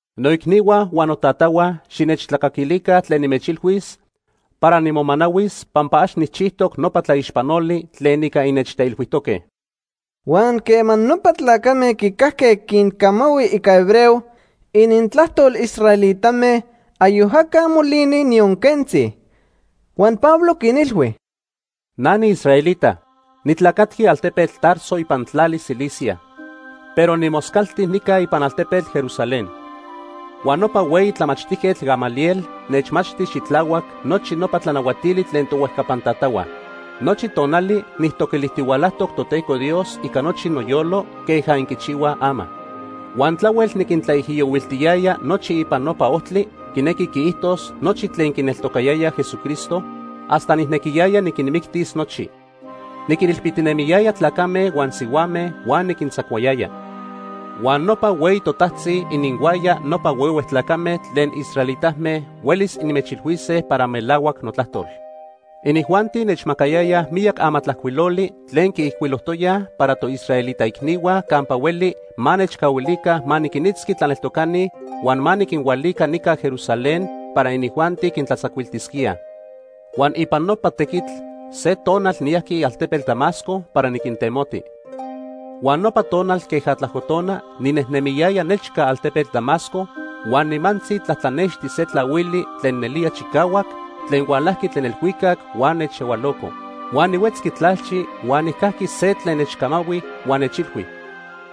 “Noicnihua huan notatahua, xinechtlacaquilica tlen nimechilhuis para nimomanahuis pampa ax nijchijtoc nopa tlaixpanoli tlen ica innechteilhuijtoque.” Huan quema nopa tlacame quicajque quincamahui ica hebreo, inintlajtol israelitame, ayoc aca molini, niyon quentzi. Huan Pablo quinilhui: “Na niisraelita. Nitlacatqui altepetl Tarso ipan tlali Cilicia, pero nimoscalti nica ipan altepetl Jerusalén. Huan nopa hueyi tlamachtijquetl Gamaliel nechmachti xitlahuac nochi nopa tlanahuatili tlen tohuejcapan tatahua. Nochi tonali nijtoquilijtihualajtoc Toteco Dios ica nochi noyolo queja inquichihuaj ama. Huan tlahuel niquintlaijiyohuiltiyaya nochi ipan Nopa Ojtli quinequi quiijtos nochi tlen quineltocayayaj Jesucristo, hasta nijnequiyaya niquinmictis nochi. Niquinilpitinemiyaya tlacame huan sihuame huan niquintzacuayaya. Huan nopa hueyi totajtzi ininhuaya nopa huehue tlacame tlen israelitame huelis inmechilhuise para melahuac notlajtol. Inijuanti nechmacayayaj miyac amatlajcuiloli tlen quiijcuilojtoyaj para toisraelita icnihua campa hueli ma nechcahuilica ma niquinitzqui tlaneltocani huan ma niquinhualica nica Jerusalén para inijuanti quintlatzacuiltisquíaj. Huan ipan nopa tequitl se tonal niyajqui altepetl Damasco para niquintemoti. “Huan nopa tonal queja tlajco tona ninejnemiyaya nechca altepetl Damasco, huan nimantzi tlatlanexti se tlahuili tlen nelía chicahuac tlen hualajqui tlen elhuicac huan nechyahualo. Huan nihuetzqui tlalchi huan nijcajqui se tlen nechcamahui huan nechilhui: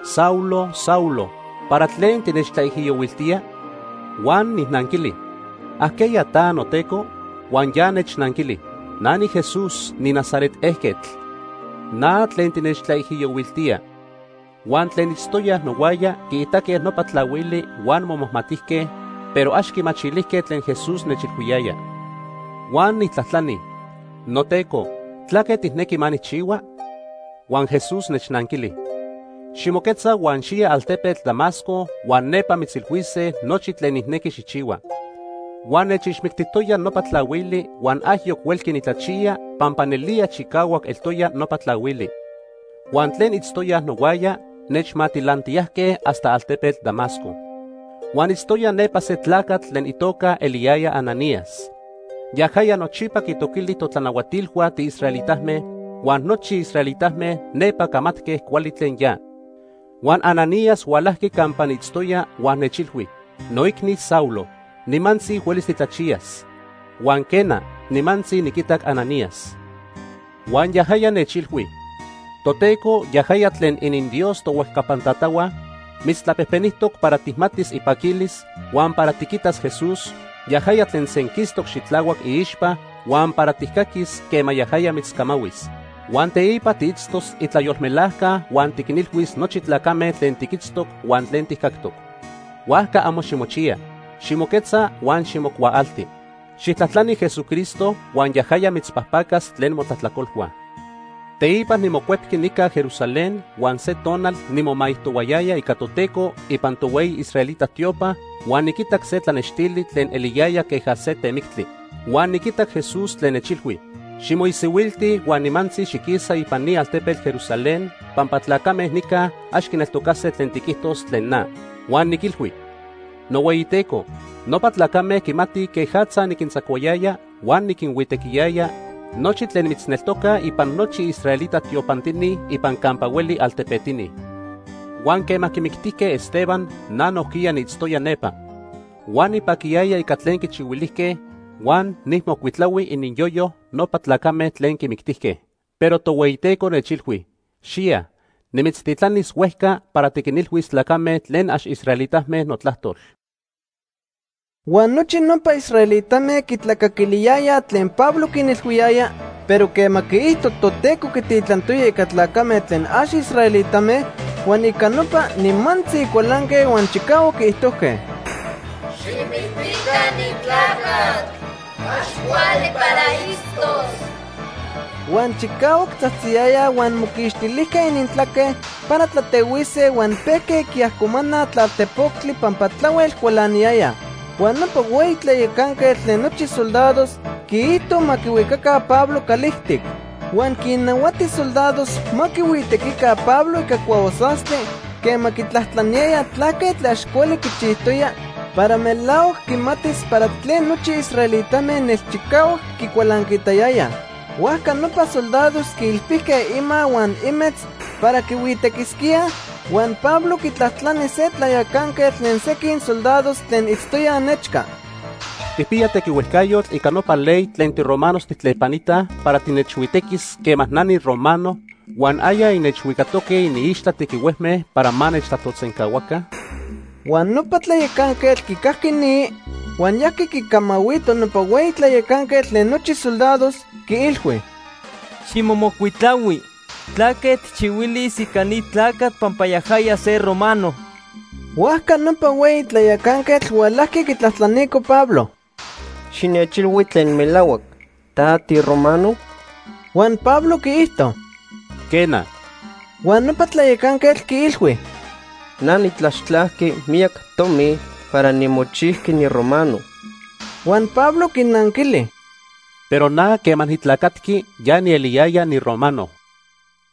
‘Saulo, Saulo, ¿para tlen tinechtlaijiyohuiltía?’ “Huan nijnanquili: ‘¿Ajqueya ta, noTeco?’ “Huan ya nechnanquili: ‘Na niJesús niNazaret ejquetl. Na tlen tinechtlaijiyohuiltía.’ “Huan tlen itztoyaj nohuaya quiitaque nopa tlahuili huan momajmatijque, pero ax quimachilijque tlen Jesús nechilhuiyaya. Huan nijtlajtlani: ‘Noteco, ¿tlaque tijnequi ma nijchihua?’ “Huan Jesús nechnanquili: ‘Ximoquetza huan xiya altepetl Damasco huan nepa mitzilhuise nochi tlen nijnequi xijchihua.’ “Huan nechixmictijtoya nopa tlahuili huan ayoc huelqui nitlachiya pampa nelía chicahuac eltoya nopa tlahuili. Huan tlen itztoyaj nohuaya nechmatilantiyajque hasta altepetl Damasco. “Huan itztoya nepa se tlacatl tlen itoca eliyaya Ananías. Yajaya nochipa quitoquili totlanahuatilhua tiisraelitame, huan nochi israelitame nepa camatque cuali tlen ya. Huan Ananías hualajqui campa niitztoya huan nechilhui: ‘Noicni Saulo, nimantzi huelis titlachiyas.’ “Huan quena, nimantzi niquitac Ananías. Huan yajaya nechilhui: ‘Toteco, yajaya tlen ininDios tohuejcapan tatahua, mitztlapejpenijtoc para tijmatis ipaquilis, huan para tiquitas Jesús, yajaya tlen senquistoc xitlahuac iixpa, huan para tijcaquis quema yajaya mitzcamahuis. Huan teipa tiitztos itlayolmelajca huan tiquinilhuis nochi tlacame tlen tiquitztoc huan tlen tijcactoc. Huajca amo ximochiya. Ximoquetza huan ximocuaalti. Xijtlajtlani Jesucristo huan yajaya mitzpajpacas tlen motlajtlacolhua.’ “Teipa nimocuepqui nica Jerusalén huan se tonal nimomaijtohuayaya ica Toteco ipan tohueyi israelita tiopa huan niquitac se tlanextili tlen eliyaya queja se temictli. Huan niquitac Jesús tlen nechilhui: ‘Ximoisihuilti huan nimantzi xiquisa ipan ni altepetl Jerusalén pampa tlacame nica ax quineltocase tlen tiquijtos tlen na.’ “Huan niquilhui: ‘NohueyiTeco, nopa tlacame quimatij quejatza niquintzacuayaya huan niquinhuitequiyaya nochi tlen mitzneltocaj ipan nochi israelita tiopantini ipan campa hueli altepetini. Huan quema quimictijque Esteban, na nojquiya niitztoya nepa. Huan nipaquiyaya ica tlen quichihuilijque huan nijmocuitlahui ininyoyo nopa tlacame tlen quimictijque.’ “Pero Tohueyiteco nechilhui: ‘Xiya. Nimitztitlanis huejca para tiquinilhuis tlacame tlen ax israelitame notlajtol.’” Huan nochi nopa israelitame quitlacaquiliyayaj tlen Pablo quinilhuiyaya, pero quema quiijto Toteco quititlantoya ica tlacame tlen ax israelitame, huan ica nopa, nimantzi cualanque huan chicahuac quiijtojque: “¡Xijmictica ni tlacatl! ¡Ax cuali para itztos!” Huan chicahuac tzajtziyayaj huan moquixtilijque inintlaque para tlatehuise huan pejque quiajcomanaj tlalpoctectli pampa tlahuel cualaniyayaj. Huan nopa hueyi tlayacanquetl tlen nochi soldados quiijto ma quihuicaca Pablo calijtic. Huan quinnahuati soldados ma quihuitequica Pablo ica cuahuasastli quema quitlajtlaniyayaj tlaque tlen ax cuali quichijtoya para melahuac quimatis para tlen nochi israelitame nelchicahuac quicualancaitayayaj. Huajca nopa soldados quiilpilijque ima huan imetz para quihuitequisquíaj, huan Pablo quitlajtlani se tlayacanquetl tlen sequin soldados tlen itztoyaj nechca: ―¿Tijpiya tequihuejcayotl ica nopa ley tlen tiromanos tijtlepanitaj para tinechhuitequis quema na niromano huan aya innechhuicatoque iniixtla tequihuejme para ma nechtlajtolsencahuaca? Huan nopa tlayacanquetl quicajqui ni, huan yajqui quicamahuito nopa hueyi tlayacanquetl tlen nochi soldados, quiilhui: ―Ximomocuitlahui tlaque tijchihuilis ica ni tlacatl pampa yajaya se romano. Huajca nopa hueyi tlayacanquetl hualajqui quitlajtlanico Pablo: ―Xinechilhui tlen melahuac. ¿Ta tiromano? Huan Pablo quiijto: ―Quena. Huan nopa tlayacanquetl quiilhui: ―Na nitlaxtlajqui miyac tomi para nimochijqui niromano. Huan Pablo quinanquili: ―Pero na quema nitlacatqui, ya nieliyaya niromano.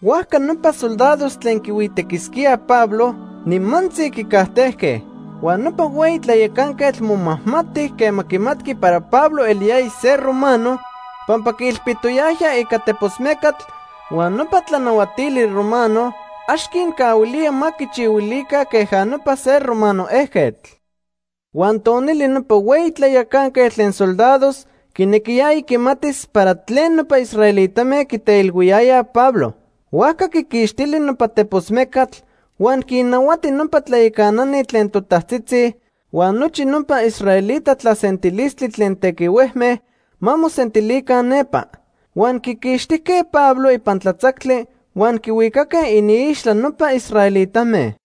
Huajca nopa soldados tlen quihuitequisquíaj Pablo nimantzi quicajtejque. Huan nopa hueyi tlayacanquetl momajmati quema quimatqui para Pablo eliyaya se romano, pampa quiilpitoyajya ica tepos mecatl huan nopa tlanahuatili romano ax quincahuilía ma quichihuilica queja nopa se romano ejquetl. Huan tonili nopa hueyi tlayacanquetl tlen soldados quinequiyaya quimatis para tlen nopa israelitame quiteilhuiyayaj Pablo. Huajca quiquixtili nopa tepos mecatl, huan quinnahuati nopa tlayacanani tlen totajtzitzi huan nochi nopa israelita tlasentilistli tlen tequihuejme ma mosentilica nepa. Huan quiquixtijque Pablo ipan tlatzactli huan quihuicaque iniixtla nopa israelitame.